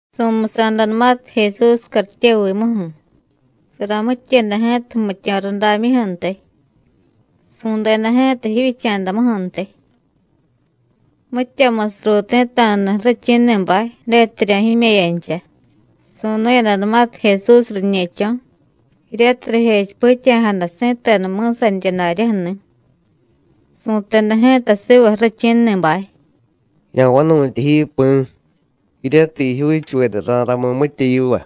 Su̱musa̱danumatiy Jesús cartyevimuju̱, saramityeda ji̱ta jmityo̱ rudamyuju̱ntiy, su̱deda ji̱ta jivyicha̱damuju̱ntiy. Mityamusiy ruuti̱ta̱dani̱ ju̱richi̱ni̱bay detiryo̱ jime̱yancha. Su̱nu̱yadanumatiy Jesús riñe̱cho̱, jiryatiy rijechipityaja̱jada si̱tenu mi̱sanirya daryaju̱ni̱, su̱teda ji̱ta siva ju̱richi̱ni̱bay: “Ya̱vanu̱tya ji, Pi̱, jiryatiy jijyuuchuveda ra̱ramiy mitya yiva.”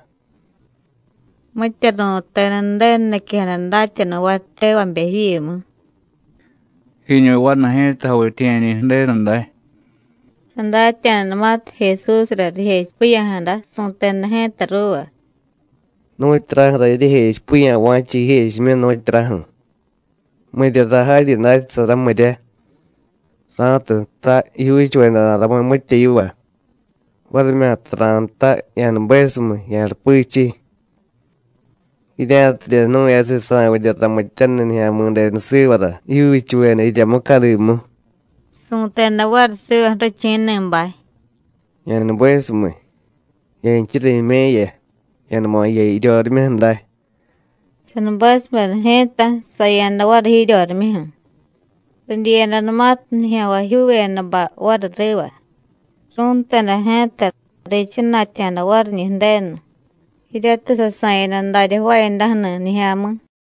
Mitya ru̱teda Ju̱denu niquejada datyanuvay tevabe jivyimu: “Jiñu vanu ji̱ta javityiye̱ñi̱ Ju̱denu day.” Sadatya̱danumatiy Jesúsra rijechipiya̱jada, su̱teda ji̱ta ruuva: “¿Nu̱tyuraju̱ra jiryejechipiya̱ va̱cha jijechimyu, nu̱tyuraju̱? ¿Miryara jaryi datyasara, mirya? ra̱tiy jtay: Jijyuuchuveda ra̱ramiy mitya yiva, varimyata ra̱jtay: Ya̱nubesumiy, ya̱rupichiy. Jirya̱tidye jnu̱yasiy sa̱vidye ramityaniy Nijya̱mi̱denu sivara jijyuuchuveda jirya mucadimu,” su̱teda variy siva ju̱richi̱ni̱bay: “Ya̱nubesumiy, ya̱nchura jime̱ya, ya̱numa jiya jiryorimyuju̱ day.” Sanubesubeda ji̱ta, saya̱da variy jiryorimyuju̱. Ridyiyadanumatiy nijya̱nvajyuuvedabay variy riva, ru̱nteda ji̱ta, riichana̱tya̱da variñi̱ Ju̱denu, jiryatiy sasa̱yada darya jvaayadaju̱ni̱ nijya̱mi̱.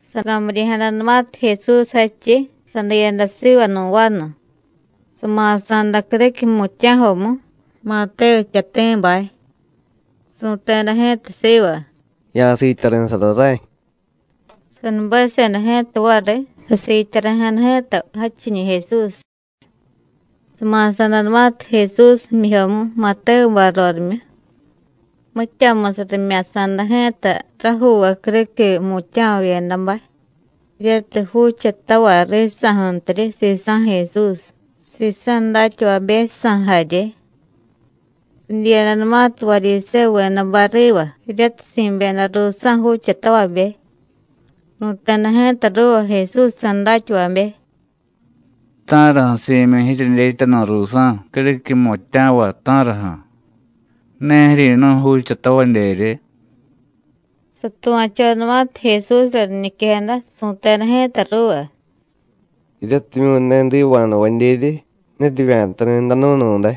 Saramiryi̱jadanumatiy Jesús jadchiy, sadiyada siva nu̱ vanu, sama̱sa̱da criquiy jmutya̱jomu, Matévu jtyati̱bay. Su̱teda ji̱ta siva: “Ya̱siityari̱sara ray.” Sanubeseda ji̱ta variy, sasiityari̱jada ji̱ta jadchiñi̱ Jesús. Sama̱sa̱danumatiy Jesús jmyijyomu Matévubay rorimyu, mityamusiy rimya̱sa̱da ji̱ta rajuuvay criquiy jmutya̱vavyedabay, jiryatiy juuchatavay risa̱ju̱ntiryi sisa̱ Jesús, sisa̱ datyavabejsa̱ jarye. Ridyiyadanumatiy Varyisévuvedabay riva jiryatiy si̱byeda ruusa̱ juuchatavabe, ru̱teda ji̱ta ruuva Jesúsjsa̱ datyavabe: “¿Ta̱raju̱ si̱myi jiryedyetyanu̱ ruusa̱ criquiy jmutya̱vay, ta̱raju̱? ¿Ne jiryi̱nu̱y juuchatavadyeryi?” Satuva̱chodanumatiy Jesúsra riñiquejada, su̱teda ji̱ta ruuva: “Jiryatimyu̱ ne jdiva̱jnuvadyeryi, ne rivya̱tani̱ jdanu̱nu̱day;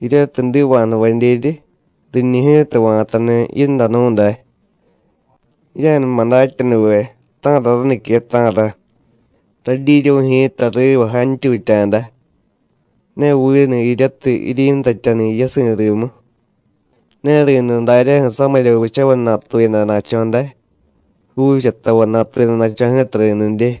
jiryatiy jdiva̱jnuvadyeryi, riñi ji̱ta va̱tani̱ ji̱ndanu̱ day. Jirya̱numa datyanuve ta̱ra ranique, ta̱ra: Radyiryu̱y ji̱ta riva jantyutya̱da, ne vinu jiryatiy jiryi̱ntatyani̱ yasi̱ rimu. Ne ri̱niy daryaju̱ samirya vichavay natuyadana̱cho̱ day, juuchatavay natuyadana̱cho̱ ji̱ta ri̱nidye.”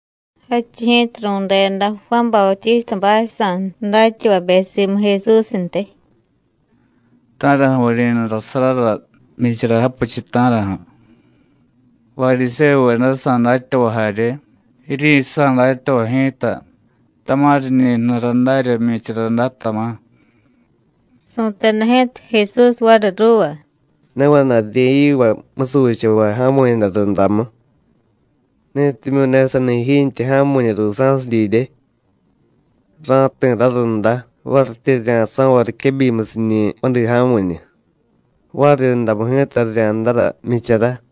Jadchiy ji̱ta ru̱deda Juán Bautístabaysa̱ datyavabe simu Jesúsntiy: “¿Ta̱raju̱ vuryi̱nurasarara jmyichara japichiy, ta̱raju̱? Varyisévuvedajsa̱ datyavay jarye, jiryisa̱ datyavay ji̱ta tama̱ riñi jnura darya jmyichara day, tama̱.” Su̱teda ji̱ta Jesús variy ruuva: “Ne vana̱y rirya̱yivay musuchavay ja̱mu̱yada rundamu, netimyu̱ ne sani jiintye ja̱mu̱ñu ruusa̱siy didye. Ra̱jti̱ rarunda varityi rirya̱so̱vay riquebyimusiñi̱ vadi ja̱mu̱ñu, variryundamu ji̱ta rirya̱ndara jmyichara.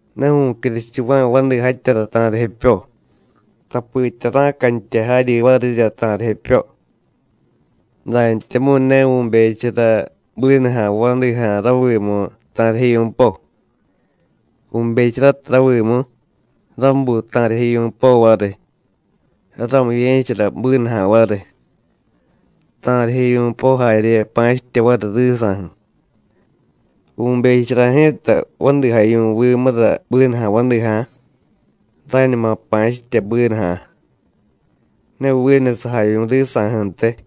Ne vu̱cyuruchuva̱y vadijatyara ta̱rijepyo, tapitya ra̱cantya jaryi varirya ta̱rijepyo. Dantyamu̱y ne vu̱bechara bínuja̱ vadija̱ ravimu ta̱rijevyu̱po: vu̱becharatiy ravimu, rabuy ta̱rijevyu̱po variy, rarumiye̱chara bínuja̱ variy, ta̱rijevyu̱po jarye pa̱chitye variy risa̱ju̱. Vu̱bechara ji̱ta vadijavyu̱vimura bínuja̱ vadija̱, rañuma pa̱chitye bínuja̱, ne vinu sajavyu̱ risa̱ju̱ntiy.”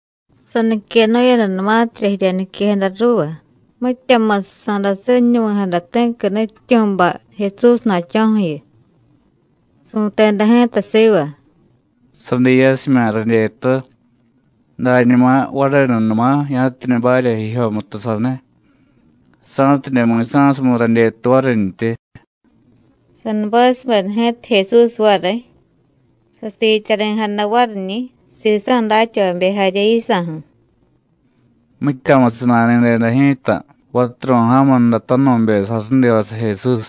Saniquenu̱yadanumatirya jirya niquejada ruuva, mityamusiy sa̱dasiñunuvi̱jada ti̱qui nutyityu̱bay Jesúsna̱cho̱ju̱yu. Su̱teda ji̱ta siva: “Sadiiyasimya̱ radyetu, dañuma varenunuma ya̱tidye barya jijyomutu saniy, sa̱tidye mi̱sa̱sumiy radyetu varintyi.” Sanubesubeda ji̱ta Jesús variy, sasiityari̱jada variñi̱, sisa̱ datyavabe jarye yisa̱ju̱. Mityamusiy nani̱deda ji̱ta vaturu̱y ja̱mundatanu̱be sarudivasiy Jesús,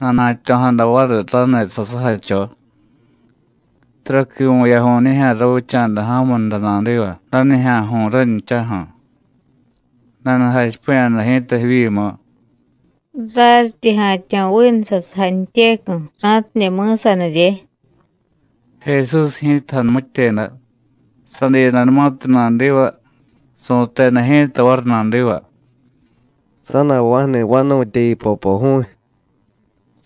nanuja̱tyo̱jada variy raniy sasujacho. Taraqui vu̱yaju̱y nijya̱ ravicha̱da ja̱munda nadiva, danijya̱ju̱y ranchaju̱. Nanujachipiya̱jada ji̱ta jivyimu: “Raryitye ja̱tyo̱ vinu sasujantyecu̱, ra̱tidye mi̱sanirye.” Jesús ji̱ta janumityeda, sadiyadanumatiy nadiva, su̱teda ji̱ta variy nadiva: “Sa̱na̱jva̱ju̱ni vanu̱tyayu, Popoju̱y.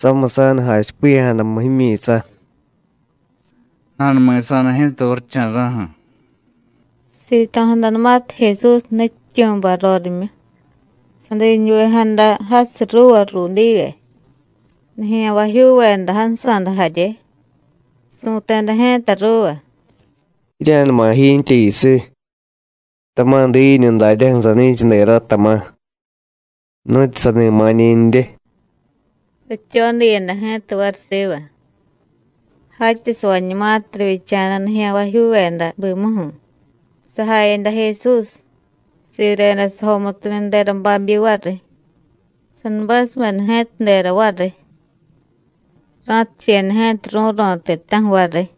Samiy sa̱nujachipiya̱jadamu jimyi̱sa.” Nanumi̱sa̱da ji̱ta varicha̱ra̱ju̱. Sito̱jadanumatiy Jesús nutyityu̱bay rorimyu, sadiñuvejada jasiy ruuva ruudivye, nijya̱nvajyuuveda jansa̱da jarye. Su̱teda ji̱ta ruuva: “Jirya̱numa jiintye jiyusiy, tama̱ diiñu daryaju̱ sani̱cha dera, tama̱, nu̱tyu sani ma̱ñi̱ndye.” Rityodiyada ji̱ta variy siva. Jatyasavañumatiy rivyicha̱da nijya̱nvajyuuveda bimuju̱, sajayada Jesús, sireda sajomutuniy dera babyi variy, sanubesubeda ji̱ta dera variy. Ra̱ticheyada ji̱ta ru̱ro̱ ti̱ta̱ju̱ variy.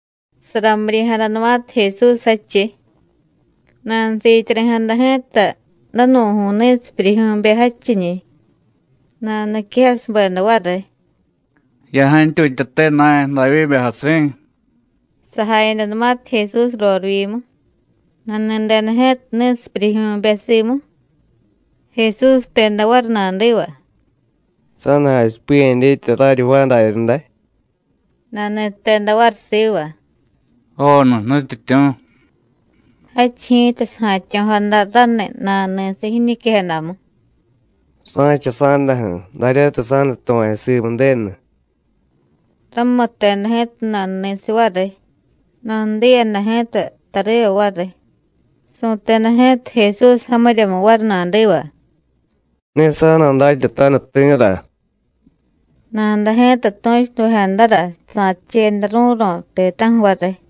Saramiryi̱jadanumatiy Jesús jadchiy, nanusiityari̱jada ji̱ta danu̱ju̱y ni̱sipyuryijyu̱be jadchiñi̱. Nanuniquejasubeda variy: “¡Ya̱jantyutyate na̱y, Davyíbe jasi̱!” Sajayadanumatiy Jesús rorivyimu, nani̱deda ji̱ta ni̱sipyuryijyu̱be simu, Jesús jteda variy nadiva: “¿Sa̱da jachipiya̱ dyetya raryi jvaay daryaday?” Nani̱teda variy siva: “Joonu, Nutyityu̱.” Jadchiy ji̱ta saja̱tyo̱jada raniy nanuni̱siy jiñiquejadamu: “Ra̱cha sa̱daju̱ daryatiy sa̱nutuva̱chu simu Ju̱denu.” Ramutteda ji̱ta nanuni̱siy variy, nanudiyada ji̱ta tariva variy. Su̱teda ji̱ta Jesús jamiryamu variy nadiva: “Ne sa̱na̱datyataniy ti̱ra.” Nada ji̱ta tu̱chunuvejadara sa̱ticheyada ru̱ro̱ ti̱ta̱ju̱ variy.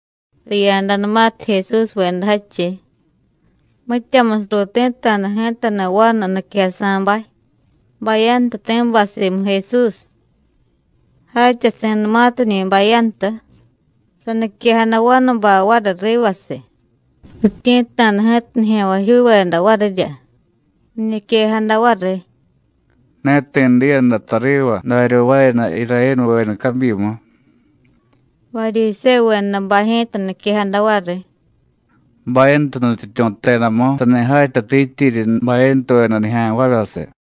Riya̱danumatiy Jesúsveda jadchiy, mityamusiy ruuti̱ta̱da ji̱tani̱ vanu niquejasa̱bay, bayantuti̱bay simu Jesús. Jatyasi̱numatiñi̱ bayantu, saniquejada vanubay variy rivasiy. Rityi̱tta̱da ji̱ta nijya̱nvajyuuveda varirya, riñiquejada variy: “Ne ti̱ diyada tariva darya jvaayada Irayénuveda cabyimu.” Varyisévuvedabay ji̱ta niquejada variy: “Bayantu nutyityu̱ jtedamu sani jatyatityiryi bayantuveda nijya̱nvavyasiy.”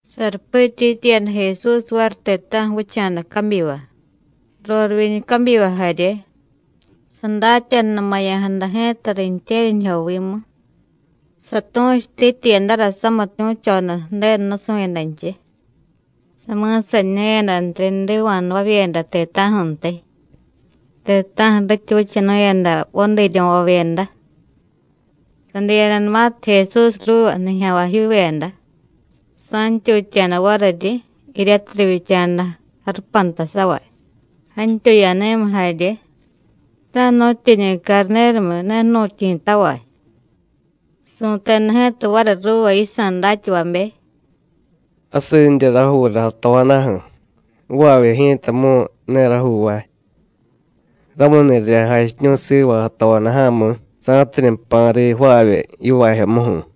Sarupityityiyada Jesús variy ti̱ta̱ju̱ vicha̱da cabyiva, rorivyiñu cabyiva jarye. Sadatyanunumaya̱jada ji̱ta riintye̱ryanijyovimu, satu̱chutityiyadara samitu̱choda Ju̱denu nusu̱yadanchiy, sami̱saniñu̱yadantiryi jdiva̱jnuvavyeda ti̱ta̱ju̱ntiy, ti̱ta̱ju̱ rityi vichanu̱yada vadiiryo̱vavyeda. Sadiyadanumatiy Jesús ruuva nijya̱nvajyuuveda, sa̱ntyutya̱da variryi, jiryatiy rivyicha̱da jarupantasavay, jantyuyani̱miy jarye, ta̱jnu̱tyiñi carni̱rumiy ne jnu̱tyi̱tavay. Su̱teda ji̱ta variy ruuva yisa̱ datyavabe: “Jasinrya rajuura jatojadaju̱, jvaavye ji̱tamu̱y ne rajuuvay. Ramuni̱ jirya̱jachiñu̱y siva jatojadaja̱mi̱, sa̱tidye jpa̱ riy jvaavye yivaajyomuju̱.”